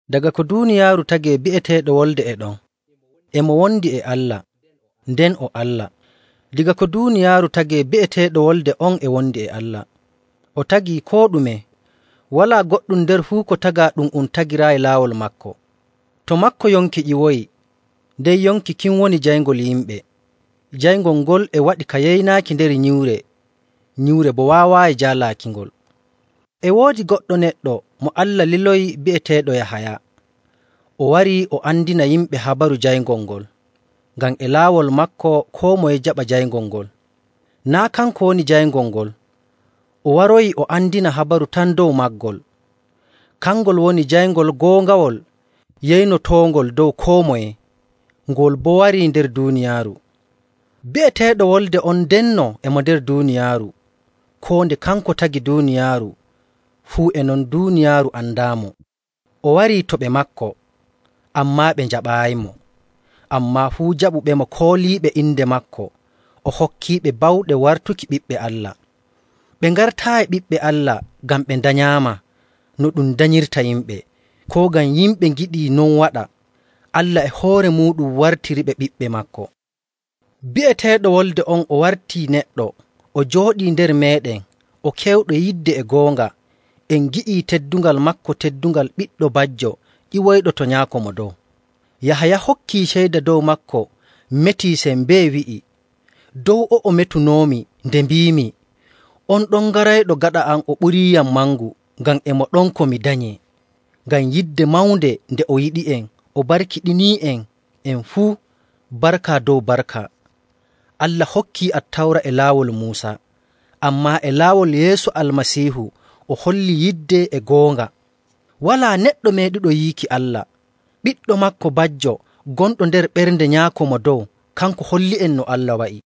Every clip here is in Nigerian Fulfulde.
Daga ko duuniyaaru tagee bi'eteeɗo Wolde e ɗon, e mo wondi e Allah, nden o Allah. Daga ko duuniyaaru tagee bi'eteeɗo Wolde on e wondi e Allah. O tagii koo ɗume. Walaa goɗɗum nder fuu ko tagaa ɗum um tagiraayi laawol maako. To maako yonki ƴiwoyi, nden yonki kin woni jayngol yimɓe. Jayngol ngol e waɗi ka yeynaaki nder nyiwre, nyiwre boo waawaayi jaalaakingol. E woodi goɗɗo neɗɗo mo Allah liloyi bi'eteeɗo Yahaya.. O warii o andina yimɓe habaru jayngol ngol, ngam e laawol maako koo moye jaɓa jayngol ngol. Naa' kanko woni jayngol ngol. O waroyi o andina habaru tan dow maagol. Kangol woni jayngol goongawol yeynotoongol dow koo moye. Ngol boo warii nder duuniyaaru. Bi'eteeɗo Wolde on ndenno e mo nder duuniyaaru. Koo nde kanko tagi duuniyaaru, fuu e non duuniyaaru andaamo. O warii to ɓe maako, ammaa ɓe njaɓaayimo. Ammaa fuu jaɓuɓemo kooliiɓe inde maako, o hokkiiɓe bawɗe wartuki ɓiɓɓe Allah. Ɓe ngartaayi ɓiɓɓe Allah ngam ɓe ndanyaama no ɗum danyirta yimɓe, koo ngam yimɓe ngiɗi non waɗa. Allah e hoore muuɗum wartiriɓe ɓiɓɓe maako. Bi'eteeɗo Wolde on, o wartii neɗɗo, o jooɗii nder meeɗen, o kewɗo yidde e goonga. En ngi'ii teddungal maako, teddungal ɓiɗɗo bajjo ƴiwoyɗo to Nyaako Mo Dow. Yahaya hokkii ceyda dow maako, metii sembee wi'ii, “Dow o'o metunoomi nde mbiimi, ‘On ɗon garayɗo gaɗa am o ɓuriiyam mangu, ngam e mo ɗon ko mi danyee.’” Ngam yidde mawnde nde o yiɗi'en, o barkiɗinii'en en fuu, barka dow barka. Allah hokkii Attawra e laawol Muusa, ammaa e laawol Yeesu Almasiihu o hollii yidde e goonga. Walaa neɗɗo meeɗuɗo yiiki Allah. Ɓiɗɗo maako bajjo, gonɗo nder ɓernde Nyaako Mo Dow, kanko holli'en no Allah wa'i.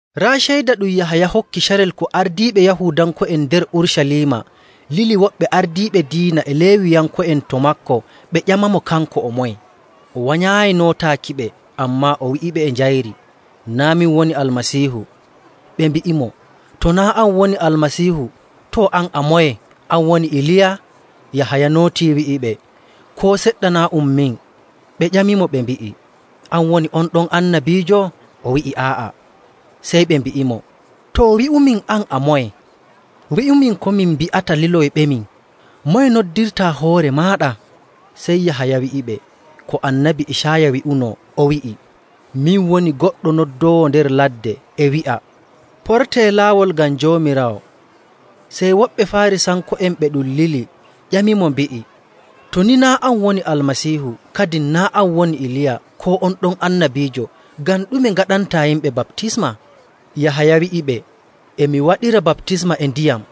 Raa ceyda ɗum Yahaya hokki carel ko ardiiɓe Yahuudanko'en nder Urucaliima lili woɓɓe ardiiɓe diina e Leewiyanko'en to maako ɓe ƴamamo kanko o moye. O wanyaayi nootaakiɓe, ammaa o wi'iɓe e njayri, “Naa' min woni Almasiihu.” Ɓe mbi'imo, “To naa' an woni Almasiihu, too, an a moye? An woni Iliya?” Yahaya nootii wi'iɓe, “Koo seɗɗa, naa' ɗum min.” Ɓe ƴamimo ɓe mbi'i, “An woni on ɗon annabiijo?” O wi'i, “Aa'a.”. Sey ɓe mbi'imo, “Too, wi'umin, an, a moye? Wi'umin ko min mbi'ata liloyɓemin. Moye noddirtaa hoore maaɗa?” Sey Yahaya wi'iɓe ko Annabi Icaaya wi'uno, o wi'i, “Min woni goɗɗo noddoowo nder ladde e wi'a, ‘Portee laawol ngam Joomiraawo.’”. Sey woɓɓe Faarisanko'en ɓe ɗum lili ƴamimo mbi'i, “To ni naa' an woni Almasiihu, kadin naa' an woni Iliya, koo on ɗon annabiijo, ngam ɗume ngaɗantaa yimɓe baptisma?” Yahaya wi'iɓe, “E mi waɗira baptisma e ndiyam,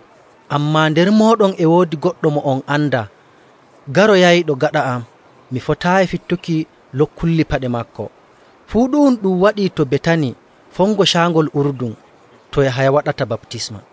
ammaa nder mooɗon e woodi goɗɗo mo on andaa, garoyayɗo gaɗa am. Mi fotaayi fittuki lokkulli paɗe maako.” Fuu ɗu'um ɗum waɗii to Betani fongo Caangol Urdun, to Yahaya waɗata baptisma.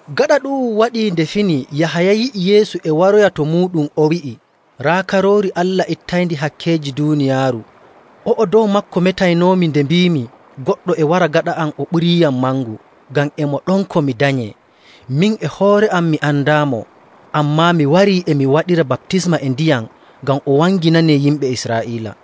Gaɗa ɗu'um waɗii nde fini Yahaya yi'i Yeesu e waroya to muuɗum, o wi'i, “Raa Karoori Allah, ittayndi hakkeeji duuniyaaru! O'o dow maako metaynoomi nde mbiimi, ‘Goɗɗo e wara gaɗa am o ɓuriiyam mangu, ngam e mo ɗon ko mi danyee.’ Min e hoore am mi andaamo, ammaa mi warii e mi waɗira baptisma e ndiyam ngam o wanginanee yimɓe Israa'iila.”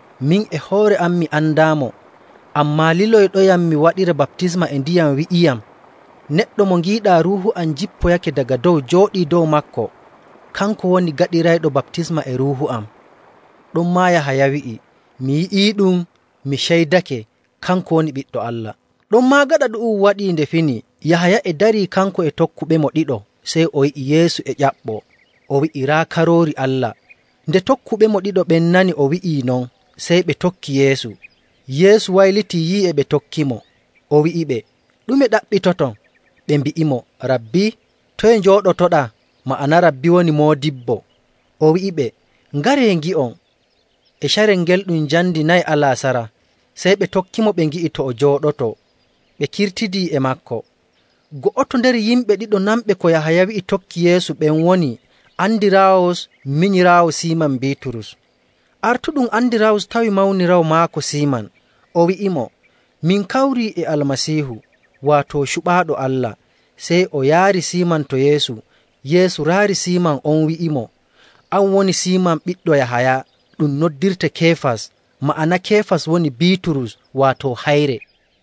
Min e hoore am mi andaamo, ammaa liloyɗoyam mi waɗira baptisma e ndiyam wi'iyam, ‘Neɗɗo mo ngiiɗaa Ruuhu am jippoyake daga dow jooɗii dow maako, kanko woni gaɗirayɗo baptisma e Ruuhu am.’” Ɗonmaa Yahaya wi'i, “Mi yi'iiɗum, mi ceydake kanko woni Ɓiɗɗo Allah.” Ɗonmaa gaɗa ɗu'um waɗii nde fini Yahaya e darii kanko e tokkuɓemo ɗiɗo, sey o yi'i Yeesu e ƴaɓɓoo, o wi'i, “Raa Karoori Allah!” Nde tokkuɓemo ɗiɗo ɓen nani o wi'ii non, sey ɓe tokki Yeesu. Yeesu waylitii yi'i e ɓe tokkimo, o wi'iɓe, “Ɗume ɗaɓɓitoton?” Ɓe mbi'imo, “Rabbi, toye njooɗotoɗaa?” Ma'ana “Rabbi” woni “moodibbo.” O wi'iɓe, “Ngaree, ngi'on.” E carel ngel ɗum njamndi nayi alaasara. Sey ɓe tokkimo ɓe ngi'i to o jooɗotoo, ɓe kirtidi e maako. Go'oto nder yimɓe ɗiɗo nanɓe ko Yahaya wi'i tokki Yeesu ɓen woni Andiraawus minyiraawo Siiman Biiturus. Artuɗum Andiraawus tawi mawniraawo maako Siiman, o wi'imo, “Min kawrii e Almasiihu,” waato Cuɓaaɗo Allah. Sey o yaari Siiman to Yeesu. Yeesu raari Siiman on wi'imo, “An woni Siiman ɓiɗɗo Yahaya. Ɗum noddirte Keefas.” Ma'ana Keefas woni Biiturus, waato “hayre.”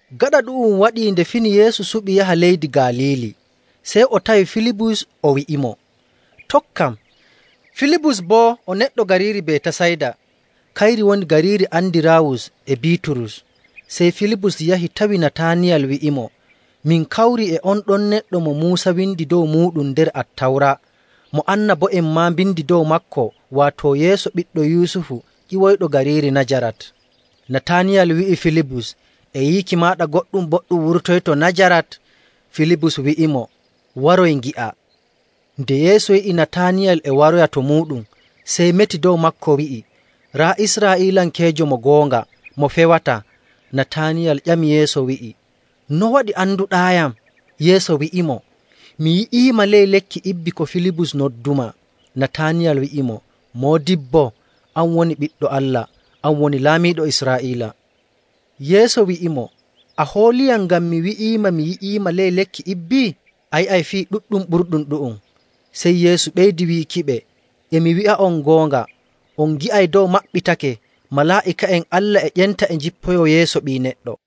Gaɗa ɗu'um waɗii nde fini Yeesu suɓi yaha leydi Galiili. Sey o tawi Filibus, o wi'imo, “Tokkam.” Filibus boo o neɗɗo gariiri Betasayda. Kayri woni gariiri Andiraawus e Biiturus. Sey Filibus yahi tawi Nataaniyal wi'imo, “Min kawrii e on ɗon neɗɗo mo Muusa windi dow muuɗum nder Attawra, mo annabo'en maa mbindi dow maako, waato Yeesu ɓiɗɗo Yusufu ƴiwoyɗo gariiri Najarat.” Nataaniyal wi'i Filibus, “E yiiki maaɗa goɗɗum boɗɗum wurtoyto Najarat?” Filibus wi'imo, “Woroy, ngi'aa.” Nde Yeesu yi'i Nataaniyal e waroya to muuɗum, sey meti dow maako, wi'i, “Raa Israa'iilankeejo mo goonga mo fewataa.” Nataaniyal ƴami Yeesu wi'i, “No waɗi anduɗaayam?” Yeesu wi'imo, “Mi yi'iima ley lekki ibbi ko Filibus noddumaa.” Nataaniyal wi'imo, “Moodibbo, an woni Ɓiɗɗo Allah! An woni laamiiɗo Israa'iila.” Yeesu wi'imo, “A hooliyam ngam mi wi'iima mi yi'iima ley lekki ibbi? A yi'ay fii ɗuɗɗum ɓurɗum ɗu'um.” Sey Yeesu ɓeydi wiikiɓe, “E mi wi'a'on goonga, on ngi'ay dow maɓɓitake, malaa'ika'en Allah e ƴenta e njippoyoo yeeso Ɓii Neɗɗo.”.